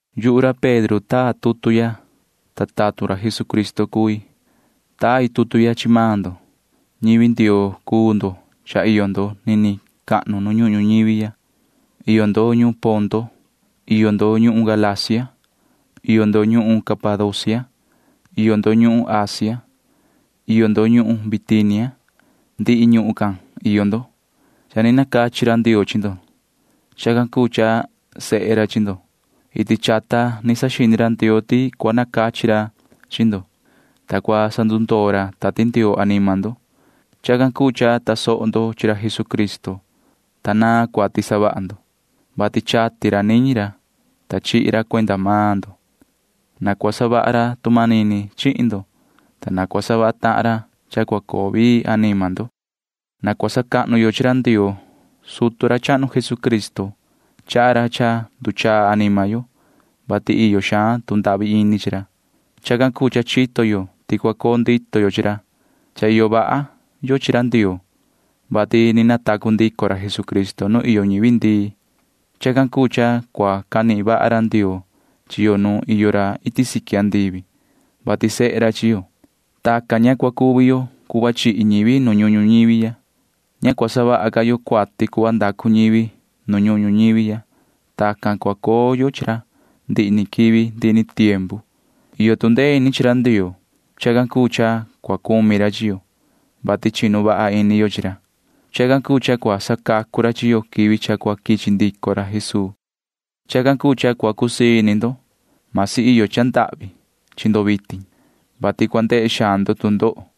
Yuhu ra Pedro taa tutu ya, ta tatun ra Jesucristo cui. Tai tutu ya chi maan ndo. Ñivi Ndioo cuu ndo, ta cha iyo nuun ndo nini cahnu nu ñuhun ñuñivi. Iyo ndo ñuhun Ponto. Iyo ndo ñuhun Galacia. Iyo ndo ñuhun Capadocia. Iyo ndo ñuhun Asia. Iyo ndo ñuhun Bitinia. Ndihi ñuhun can iyo ndo. Cha ni nacachi ra Ndioo chi ndo. Chacan cuu cha sehe ra chi ndo. Iti chata chito ra Ndioo ti cua nacachi ra chi ndo, ta cua sandundoo ra Tati Ndioo anima ndo. Chacan cuu cha tasoho ndo chi ra Jesucristo, ta naan cuati savaha ndo, vati chati ra niñi ra, ta chihi ra cuenda maan ndo. Na cua savaha ra tu manini chihin ndo, ta na cua savaha tahan ra cha cua coo vii anima ndo. Na cua sacahnu yo chi ra Ndioo ra cuu sutu ra chahnu Jesucristo. Chaha ra cha nduchaa anima yo, vati iyo xaan tu ndahvi ini chi ra. Chacan cuu cha chito yo ti cua coo ndito yo chi ra. Cha iyo vaha yo chi ra Ndioo, vati ni natacu ndico ra Jesucristo nu iyo ñivi ndii. Chacan cuu cha cua canihin vaha ra Ndioo chi yo nu iyo ra iti siqui andivi, vati sehe ra chi yo. Tacan ña cua cuvi yo cuhva chihi ñivi nu ñuhun ñuñivi ya. Ña cua savaha ca yo cuati cuhva ndacu ñivi nu ñuhun ñuñivi ya, ta cua coo yo chi ra ndihi ni quivi ndihi ni tiempu. Iyo tu ndee ini chi ra Ndioo. Chacan cuu cha cua cumi ra chi yo, vati chinu vaha ini yo chi ra. Chacan cuu cha cua sacacu ra chi yo quivi cha cua quichi ndico ra Jesuu. Chacan cuu cha cua cusii ini ndo. Vasi iyo cha cua coo ndahvi ini ndo suhva vitin, vati cua ndehe xaan ndo tu ndoho,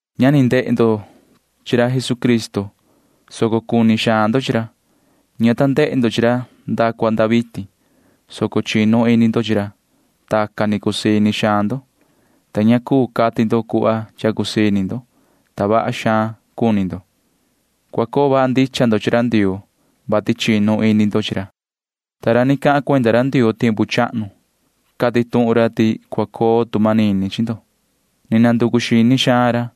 Ña ni ndehe ndo chi ra Jesucristo, soco cuni xaan ndo chi ra. Ña ta ndehe ndo chi ra nda cua nda vitin, soco chinu ini ndo chi ra. Tacan ni cusii ini xaan ndo. Ña nihin ndo cuhva cha cua cuhva ndo cuenda cha cusii ini ndo, ta vaha xaan cuni ndo. Cua coo vaha ndicha ndo chi ra Ndioo, vati chinu ini ndo chi ra. Ta ra ni cahan cuenda ra Ndioo tiempu chahnu―cati tuhun ra ti cua coo tu manini chi ndo. Nanducu xini xaan ra,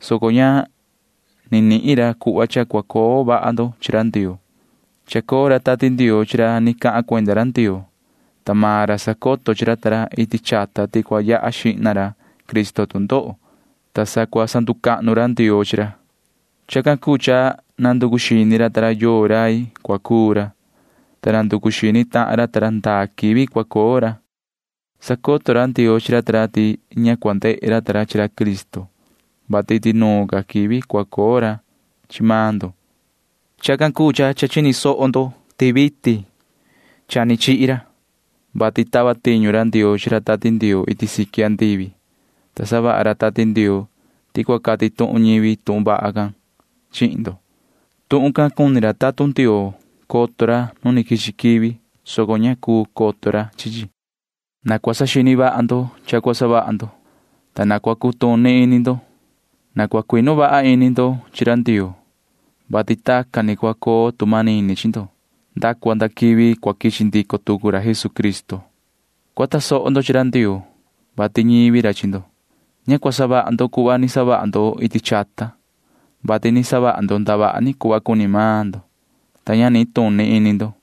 soco ña ni nihin ra cuhva cha cua coo vaha ndo chi ra Ndioo. Iyo ra Tati Ndioo chi ra ni cahan cuenda ra Ndioo, ta maan ra sacoto chi ra ta ra iti chata ti cua yaha xihna ra Cristo tu ndoho, ta sa cua sacahnu ra Ndioo chi ra. Chacan cuu cha nanducu xini ra ta ra yoo rai cua cuu ra, ta nanducu xini tahan ra ta ra ndaa quivi cua coo ra. Sacoto ra Ndioo chi ra ta ra ti ña cua ndehe ra ta ra chi ra Cristo, vati iti nuun ca quivi cha cua coo maan ndo cua coo ra. Chacan cuu cha cha chini soho ndo ti vitin ni chacoo ra, vati tava tiñu ra Ndioo chi ra Tati Ndioo iti siqui, ta savaha ra Tati Ndioo can ti cua cati tuhun ñivi tuhun vaha can chihin ndo. Tuhun can cuni coto ra tatun Ndioo nu quichi quivi, soco ña cuu coto ra chi chi. Na cua saxini vaha ndo cha cua savaha ndo, ta na cua cutuni ini ndo. Na cua cuinu vaha ini ndo chi ra Ndioo, vati tacan ni cua coo tu manini chi ndo nda cua nda quivi cua quichi ndico tucu ra Jesucristo. Cua tasoho ndo chi ra Ndioo, vati ñivi ra chi ndo. Ña cua savaha ndo cuhva ni savaha ndo iti chata, vati ni savaha ndo ndavaha ni cuhva cuni maan ndo, ta ña nituni ini ndo.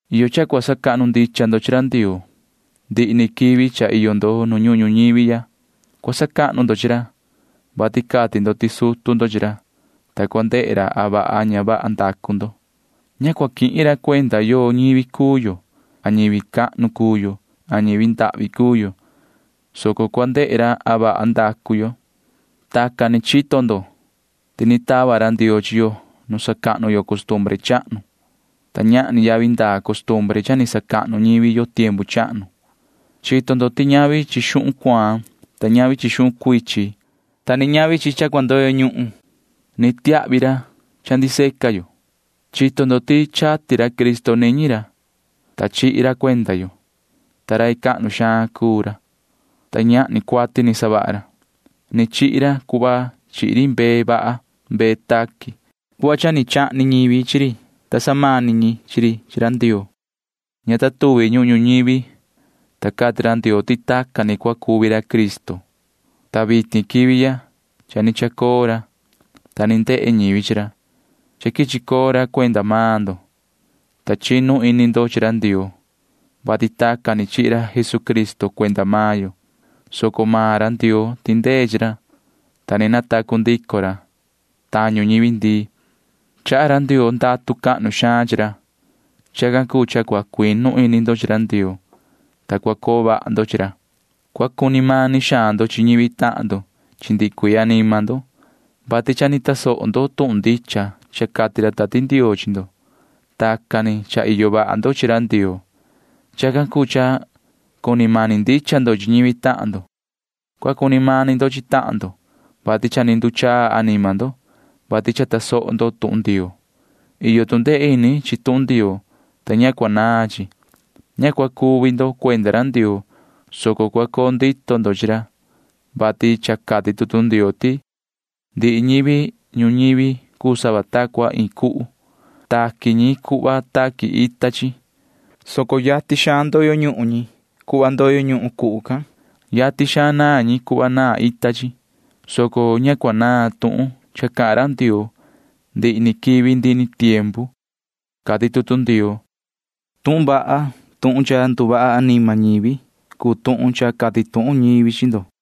Iyo cha cua sacahnu ndicha ndo chi ra Ndioo. Ndihi quivi cha iyo ndo nu ñuhun ñuñivi ya cua sacahnu ndo chi ra. Cua sacahnu ndo chi ra, vati cati ndo ti sutu ndo chi ra, ta cua ndehe ra a vaha a ña vaha ndacu ndo. Ña cua quihin ra cuenda yoo ñivi cuu yo a ñivi cahnu cuu yo a ñivi ndahvi cuu yo, soco cua ndehe ra a vaha ndacu yo. Tacan ni chito ndo ti ni tava ra Ndioo chi yo nu sacahnu yo costumbre chahnu, ta ñahni yavi ndaa costumbre can cha ni sacahnu ñivi yo tiempu chahnu. Chito ndo ti ñavi chi xuhun cuaan, ñavi chi xuhun cuichin, ñavi chi cha cua ndoyo ñuhun tava ra chi yo. Chito ndo ti chati ra Cristo niñi ra, ta chihi ra cuenda yo, ta rai cahnu xaan cuu ra, ta ñahni cuati ni savaha ra. Ni chihi ra cuhva chihi ri mbee vaha mbee taqui, ta chahni ñivi chi ri, ta samani ñi chi ri chi ra Ndioo. Ña ta tuvi ñuhun ñuñivi, ta cati ra Ndioo ti tacan ni cua cuvi ra Cristo, ta vitin quivi ya cha ni chacoo ra, ta ni ndehe ñivi chi ra. Cha quichi coo ra cuenda maan ndo, ta chinu ini ndo chi ra Ndioo, vati tacan ni chihi ra Jesucristo cuenda maan yo, soco maan ra Ndioo tindee chi ra, ta ni natacu ndico ra tañu ñivi ndii. Chaha ra Ndioo ndatu cahnu xaan chi ra. Chacan cuu cha cua cuinu ini ndo chi ra Ndioo. Cua cuinu ini ndo ti cua coo vaha ndo chi ra. Cua cuni mani xaan ndo chi ñivi tahan ndo chi ndihi cuii anima ndo, vati cha ni tasoho ndo tuhun ndicha cha cati ra Tati Ndioo chi ndo. Tacan ni cha iyo vaha ndo chi ra Ndioo. Chacan cuu cha cuni mani ndicha ndo chi ñivi tahan ndo. Cua cuni mani ndo chi tahan ndo, vati cha ni nduchaa anima ndo, vati cha tasoho ndo tuhun Ndioo. Iyo tu ndee ini chi tuhun Ndioo, ta ña cua naan chi. Ña cua cuvi ndo cuenda ra Ndioo, soco cua coo ndito ndo chi ra, vati cha cati tutu Ndioo ti: Ndihi ñivi ñuñivi cuu sava ta cua iin cuhu. Taqui ñi cuhva taqui ita chi, soco yatin xaan ndoyo ñuhun ñi cuhva ndoyo ñuhun run cuhu can. Yatin xaan naan ñi cuhva naan ita chi, soco ña cua naan tuhun cha cahan ra Ndioo ndihi ni quivi ndihi ni tiempu, cati tutu Ndioo. Tuhun vaha can tuhun cha nduvaha anima ñivi cuu tuhun cha cati tuhun ñivi chi ndo.